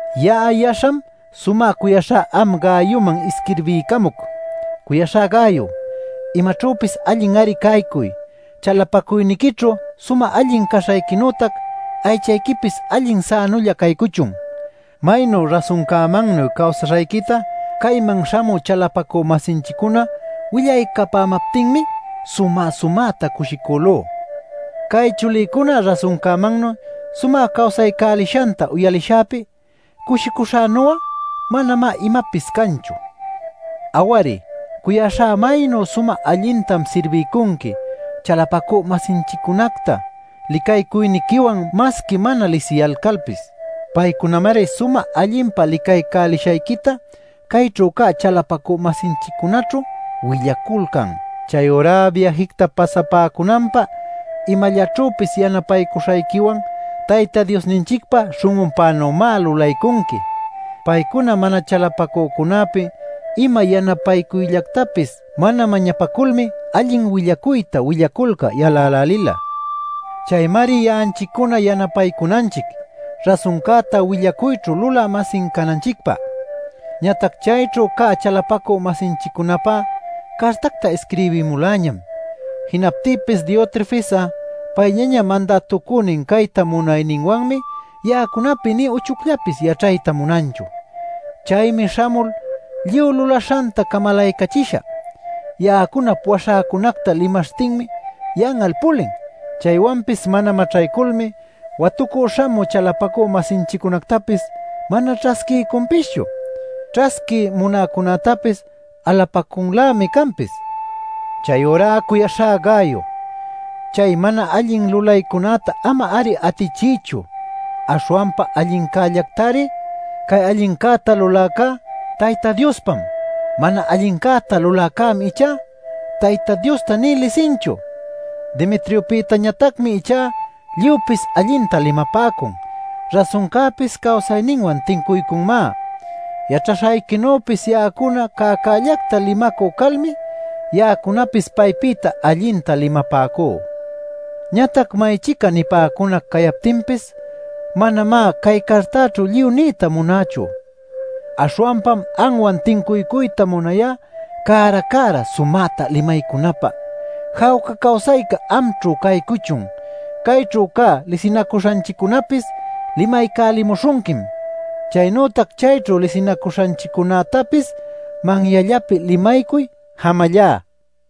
Ya'a yaśham sumä cuyaśhá am Gayoman isquirbiycamuc. Cuyaśhá Gayo, imaćhüpis allin-ari caycuy, chalapacuyniquićhu sumä allin caśhayquinütac aychayquipis, allin sänulla caycuchun. Maynu rasuncämannuy cawsaśhayquita cayman śhamü chalapacü-masinchiccuna willaycapämaptinmi sumä-sumäta cushicülú. Cay chulïcuna rasuncämannuy sumä cawsaycälishanta uyalishäpi cushicuśhänu'a manamá imapis canchu. Aw-ari, cuyaśhá, maynu sumä allintam sirbiycunqui chalapacü-masinchiccunacta licaycuyniquiwan masqui mana lisiyalcalpis. Paycunamari sumä allinpa licaycälishayquita cayćhu cä chalapacü-masinchiccunaćhu willaculcan. Chayurá biäjicta pasapäcunanpä imallaćhüpis yanapaycuśhayquiwan Tayta Diosninchicpa śhun'unpänümá lulaycunqui. Paycuna mana chalapacücunäpi ima yanapaycuyllactapis mana mañapaculmi allin willacuyta willaculcä yalälälila. Chaymari ya'anchiccuna yanapaycunanchic rasuncäta willacuyćhu lulä-masin cananchicpä. Ñatac chayćhu cä chalapacü-masinchiccunapä cartacta isquirbimuläñam. Jinaptïpis Diotrefes'a payllaña mandätucünin cayta munayninwanmi ya'acunapi nï uchucllapis yaćhayta munanchu. Chaymi śhamul lluy lulaśhanta camalaycachishä. Ya'acunap waśhäcunacta limaśhtinmi yan'al pulin. Chaywanpis mana maćhayculmi watucü śhamü chalapacü-masinchiccunactapis mana ćhasquiycunpischu. Ćhasquiy munäcunätapis alapacunlämi canpis. Chayurá cuyaśhá Gayo, chay mana allin lulaycunäta ama-ari atichiychu, aśhwanpa allincällactari. Cay allincäta luläcá Tayta Diospam. Mana allincäta luläcämi ichá Tayta Diosta nï lisinchu. Demetriopïtañatacmi ichá lluypis allinta limapäcun. Rasuncäpis cawsayninwan tincuycunmá. Yaćhaśhayquinüpis ya'acuna cäcällacta limacü calmi ya'acunapis paypïta allinta limapäcú. Ñatac may-chica nipäcunac cayaptinpis, manamá cay cartaćhu lluy niyta munächu. Aśhwanpam anwan tincuycuyta munayá cära-cära sumäta limaycunäpä. Jawca cawsayca amćhu caycuchun. Cayćhu cä lisinacuśhanchiccunäpis limaycälimuśhunquim. Chaynütac chayćhu lisinacuśhanchiccunätapis manyallapi limaycuy. Jamallá.